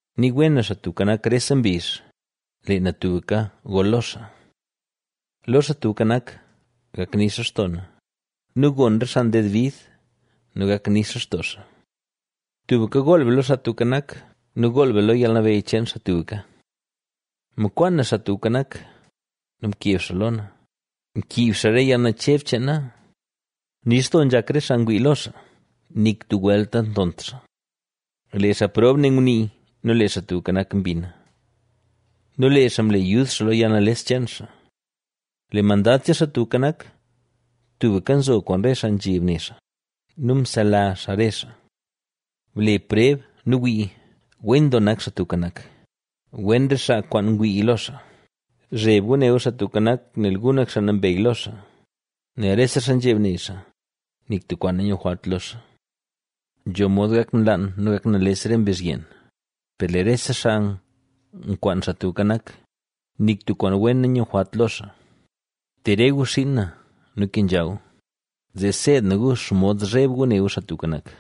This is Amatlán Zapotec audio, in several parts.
Nii wen na Xaa Tubka Nak rese mbizh; lee na tubka gol lo xaa. Lo Xaa Tubka Nak, gak nix lextoo na nu gon re xaa nded bid nu gak nix lextoo xaa. Tubka gool be lo Xaa Tubka Nak nu gool be lo yalnabeyy cheen xaa tubka. Mkwaan na Xaa Tubka Nak, nu mkeb xaa lo na; mkiib xaa re yalnacheb cheen na. Nix doo nzhak re xaa ngwii lo xaa; nik tub welt nantont xaa. Lee xaa prob ne ngunii nu lee Xaa Tubka Nak mbina nu lee xaa mle yud xaa lo yalnales cheen xaa. Lee Mandad cheen Xaa Tubka Nak, tubka nzo kwaan re xaa nzheb ne xaa nu msela xaa re xaa. Ble preb nu wii, ¡wen doo nak Xaa Tubka Nak!; wen re xaa kwaan ngwii lo xaa. Zheb gu ne gu Xaa Tubka Nak, nel gu nak xaa nambey lo xaa, nel rese xaa nzheb ne xaa, nik tub kwaan nanyujwalt lo xaa. Nzho mod gak nlaan nu gak nales re mbezh yeen, per lee rese xaa nkwaan Xaa Tubka Nak, nik tub kwaan wen nanyujwalt lo xaa. Te re gu xiin na nu kenzha gu; zee seed na gu xomod zheb gu ne gu Xaa Tubka Nak.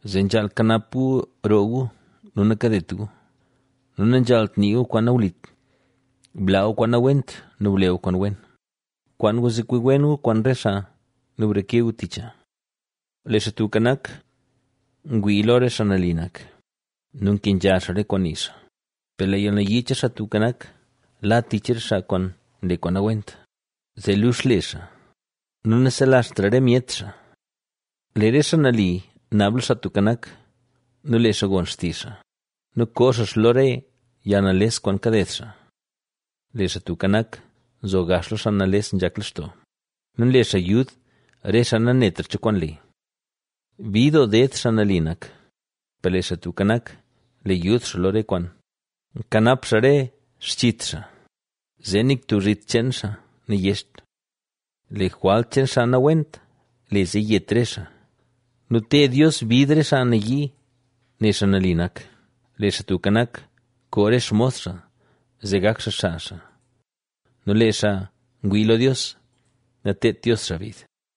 zee nzhaal kanap gu roo gu nu nakadet gu, nu nanzhaalt nii gu kwaan nawlit. Blaa gu kwaan nawent nu ble gu kwaan wen; kwaan gu zee kwi wen gu kwaan re xaa nu breke gu ticha. Lee Xaa Tubka Nak ngwii lo re xaa nali nak, nu nkenzha xaa re kwaan nii xaa; per lee yalnayii cheen Xaa Tubka Nak la tich re xaa kwaan nle kwaan nawent, zee lux le xaa, nu naselazhtra re myet xaa. Lee re xaa nali naab lo Xaa Tubka Nak, nu lee xaa gon xtizh xaa nu koo xaa xaa lo re yalnales kwaan kaded xaa. Lee Xaa Tubka Nak, nzo gax lo xaa nales nzhak lextoo nu nle xaa yud re xaa nanetra cho kwaan le. Bid doo ded xaa nali nak, per lee Xaa Tubka Nak, le yud xaa lo re kwaan; nkanap xaa re xchit xaa, zee nik tub zhit cheen xaa nayecht. Lee jwalt cheen xaa nawent le zee yet re xaa nu teed Dios bid re xaa nayii ne xaa nali nak. Lee Xaa Tubka Nak, koo re xmos xaa zee gak xaa, xaa xaa. Nu lee xaa ngwii lo Dios nateedt Dios xaa bid.